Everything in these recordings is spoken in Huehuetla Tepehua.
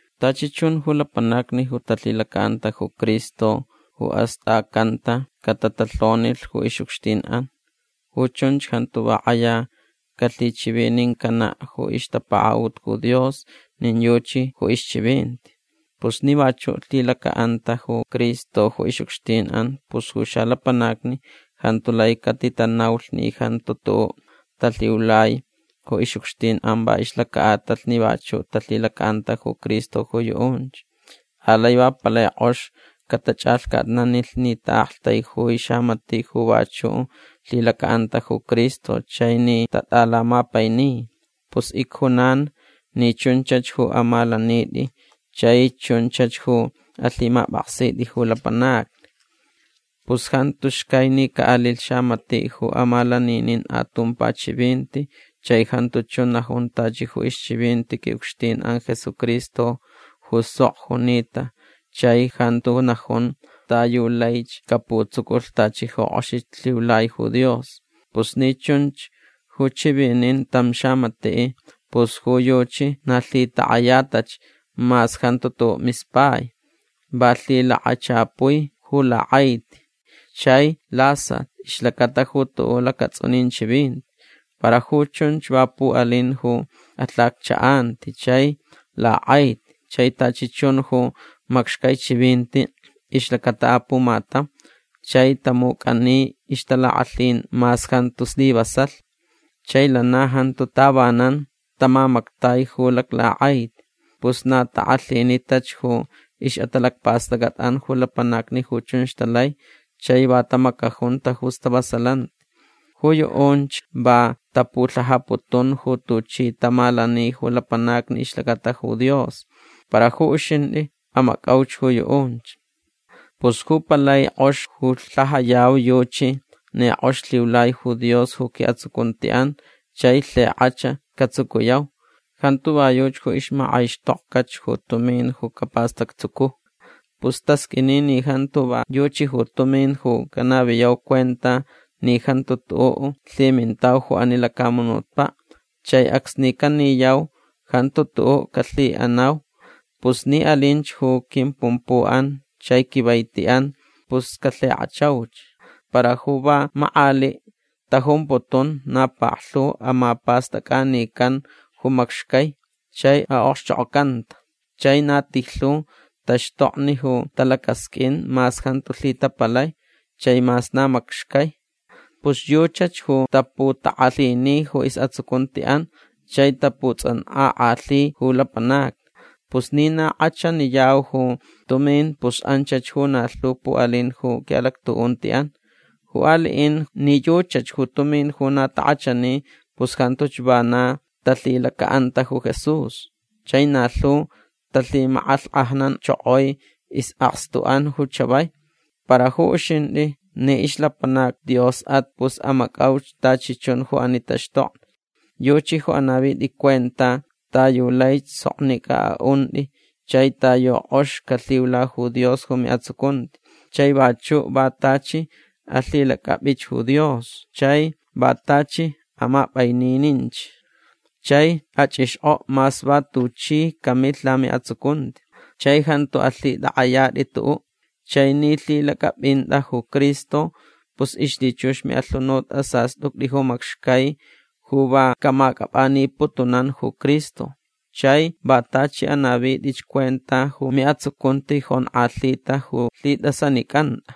Tachi chun ju lapanacni ju talhilacaʼanta ju Cristo ju astʼacanta catatalhonilh ju ixʼucxtinʼan. Ju chunch jantu va kʼaya calhichivinincanaʼ ju ixtapakaʼut ju Dios nin yuchi ju ixchivinti. Pus ni vachuʼ lhilacaʼanta ju Cristo ju ixʼucxtinʼan pus ju xalapanacni jantu lai catitanaulh ni jantu tuʼuʼ talhiulai ju ixʼucxtinʼan va ixlacaʼatalh ni vachuʼ talhilacaʼanta ju Cristo ju yuʼunch. Alai va palai kʼox catachʼalhcatnanilh ni taʼaktaijui xamatiʼ ju vachuʼ lhilacaʼanta ju Cristo chai ni tatʼalamapaini. Pus icjunan ni chunchach ju amalanitʼi chai chunchach ju alhimapʼaksitʼi ju lapanacni. Pus jantu xcai ni caʼalilh xamatiʼ ju amalaninin atumpa chivinti chai jantu chun najun tachi ju ixchivinti quiʼucxtinʼan Jesucristo ju sok junita chai jantu najun ta yu laich caputsuculh tachi ju kʼoxich lhiulai ju Dios. Pus ni chunch ju chivinin tam xamatiʼ pus ju yuchi na lhitakʼayatach mas jantu tuʼuʼ mispai. Va lhilakachapui ju lakʼaiti chai lasat ixlacata ju tuʼuʼ lacatsʼunin chivinti. Para ju chunch va puʼalin ju alhacchaʼanti chai lakʼaiti chai tachi chun ju macxcai chivinti ixlacata apumatam chai tamucʼani ixtalakʼalhin mas jantu slivasalh. Chai lana jantu tavanan tamamactai ju laclakʼaiti. Pus na takʼalhinitach ju ixʼatalacpastʼacʼatʼan ju lapanacni ju chunch talai chai va tamacajunta ju stavasalanti. Ju yuʼunch va tapulhajaputun ju tuchi tamalani ju lapanacni ixlacata ju Dios. Para ju uxintʼi amacʼauch ju yuʼunch. Pus ju palai kʼox ju lhajayau yuchi ni kʼox lhiulai ju Dios ju quiʼatsucuntiʼan chai lhikʼach catsucuyau. Jantu va yuchi ju ixmakʼaixtʼokʼach ju tumin ju capastactsucu. Pus tasqʼuini ni jantu va yuchi ju tumin ju canaviyau cuenta ni jantu tuʼuʼ lhimintau ju ani lacamunutpaʼ chai acsni caniyau jantu tuʼuʼ calhiʼanau. Pus ni alinch ju quimpumpuʼan chai quivaitiʼan pus calhikʼachauch. Para ju va makʼaliʼ tajumputun na paklhu amapastʼacʼanican ju macxcai chai aʼokxchokʼocanta. Chai na tijlhu taxtokni ju talacasqʼuin mas jantu lhitapalai chai mas na macxcai. Pus yuchach ju taputakʼalhini ju isʼatsucuntiʼan chai taputsʼankʼakʼalhi ju lapanacni. Pus ni na kʼachaniyau ju tumin pus anchach ju na lhu puʼalin ju quiʼalactuʼuntiʼan. Ju aliʼin ni yuchach ju tumin ju na takʼachani pus jantuch vana talhilacaʼanta ju Jesús. Chai na lhu talhimakʼalhkʼajnanchokoi isʼakstuʼan ju chavai. Para ju uxintʼi ni ixlapanac Diosʼat pus amacʼauch tachi chun ju ani taxtokni. Yuchi ju anavitʼi cuenta ta yu laich soknicʼa aʼuntʼi chai ta yu kʼox calhiula ju Dios ju miʼatsucunti. Chai vachuʼ va tachi alhilacʼapʼich ju Dios. Chai va tachi amapʼainininch chai achʼixkʼoʼ mas va tuchi camilh lamiʼatsucunti. Chai jantu alhitʼakʼayatʼi tuʼuʼ. Chai ni lhilacʼapʼintʼa ju Cristo pus ixlhichux ju miʼalhunut asastʼuctʼi ju macxcai ju va camacʼapʼaniputunan ju Cristo. Chai va tachi anavitʼich cuenta ju miʼatsucunti jonkʼalhita ju lhitʼasanicʼantʼa.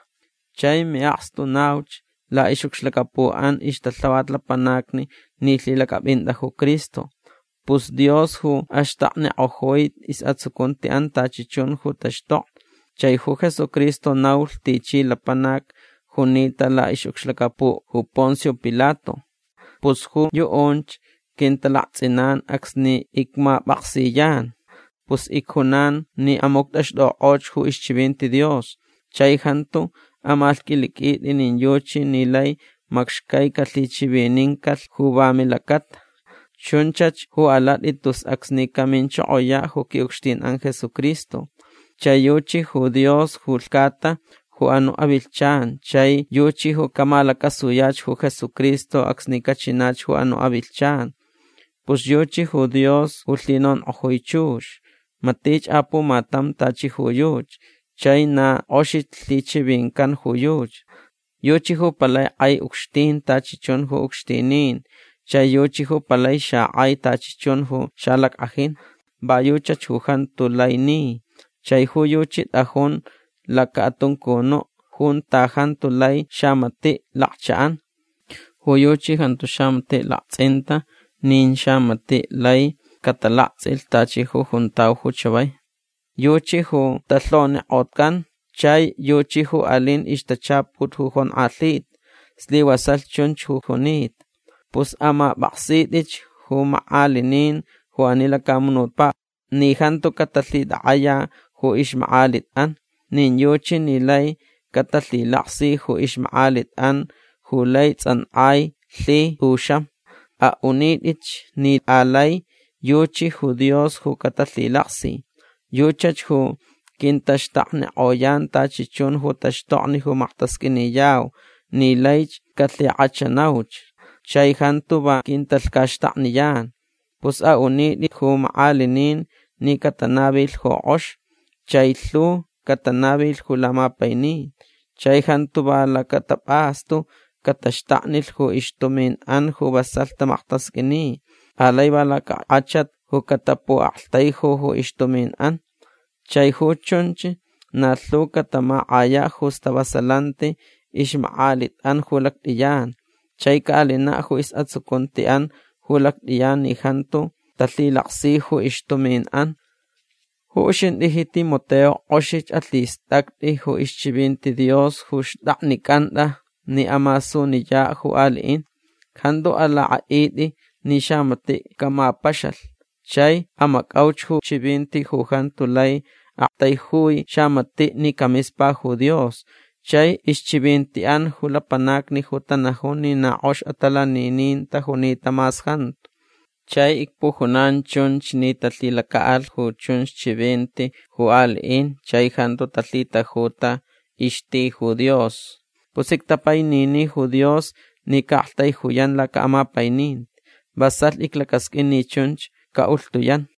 Chai miʼakstu nauch laʼixʼucxlacapuʼan ixtalhavat lapanacni ni lhilacʼapʼintʼa ju Cristo. Pus Dios ju axtaknikʼojui isʼatsucuntiʼan tachi chun ju taxtokni. Chai ju Jesucristo naulh tichi lapanac junita laʼixʼucxlacapuʼ ju Poncio Pilato. Pus ju yuʼunch quintalaktsʼinan acsni icmapʼaksiyan. Pus icjunan ni amuctʼaxtʼukʼoch ju ixchivinti Dios. Chai jantu amalhqʼuiliqʼuitʼi nin yuchi ni lai macxcai calhichivinincalh ju va milacata. Chunchach ju alatʼi tus acsni caminchokoyaʼ ju quiʼucxtinʼan Jesucristo. Chai yuchi ju Dios ju lhcata ju anuʼ avilhchan chai yuchi ju camalacasuyach ju Jesucristo acsni cachinach ju anuʼ avilhchan. Pus yuchi ju Dios ju lhinonkʼojui chux. Matich apumatam tachi ju yuchi chai na kʼoxich lhichivincan ju yuchi. Yuchi ju palai kʼai ucxtin tachi chun ju ucxtinin chai yuchi ju palai xakʼai tachi chun ju xalackʼajin. Va yuchach ju jantu lai ni. Chai ju yuchi tʼajun lacaʼatuncunuʼ junta jantu lai xamatiʼ lakchaʼan. Ju yuchi jantu xamatiʼ laktsʼinta nin xamatiʼ lai catalaktsʼilh tachi ju juntau ju chavai. Yuchi ju talhonikʼocan. Chai yuchi ju alin ixtachaput ju jonkʼalhita. Slivasalh chunch ju junita. Pus amapʼaksitʼich ju makʼalinin ju ani lacamunutpaʼ ni jantu catalhitakʼaya ju ixmakʼalitʼan. Nin yuchi ni lai catalhilaksi ju ixmakʼalitʼan ju lai tsʼankʼai lhi tʼuxam. Aʼunitʼich ni alai yuchi ju Dios ju catalhilaksi. Yuchach ju quintaxtaknikʼoyan tachi chun ju taxtokni ju maktasqʼuiniyau ni laich calhikʼachanauch. Chai jantu va quintalhcaxtakniyan. Pus aʼunitʼi ju makʼalinin ni catanavilh ju kʼox. Chai lhu catanavilh ju lamapainin. Chai jantu va lacatapʼastu cataxtaknilh ju ixtuminʼan ju vasalh tamaktasqʼuini. Alai va lacakʼachat ju catapuʼaktaiju ju ixtuminʼan. Chai ju chunch na lhu catamakʼayaʼ ju stavasalanti ixmakʼalitʼan ju lactʼiyan. Chai caʼalinaʼ ju isʼatsucuntiʼan ju lactʼiyan ni jantu talhilaksi ju ixtuminʼan. Ju uxintʼi ji Timoteo kʼoxich alhistʼactʼi ju ixchivinti Dios ju xtʼaknicʼantʼa ni amasuniyaʼ ju aliʼin. Jantu alakʼaʼitʼi ni xamatiʼ camapaxalh. Chai amacʼauch ju chivinti ju jantu lai aktaijui xamatiʼ ni camispa ju Dios chai ixchivintiʼan ju lapanacni ju tanajun ni na kʼox atalaninin tajunita mas jantu. Chai icpujunan chunch ni talhilacaʼalh ju chunch chivinti ju aliʼin chai jantu talhitajuta ixti ju Dios. Pus ictapainini ju Dios ni caʼaktaijuyan lacaʼamapaininti. Vasalh iclacasqʼuin ni chunch caʼulhtuyan.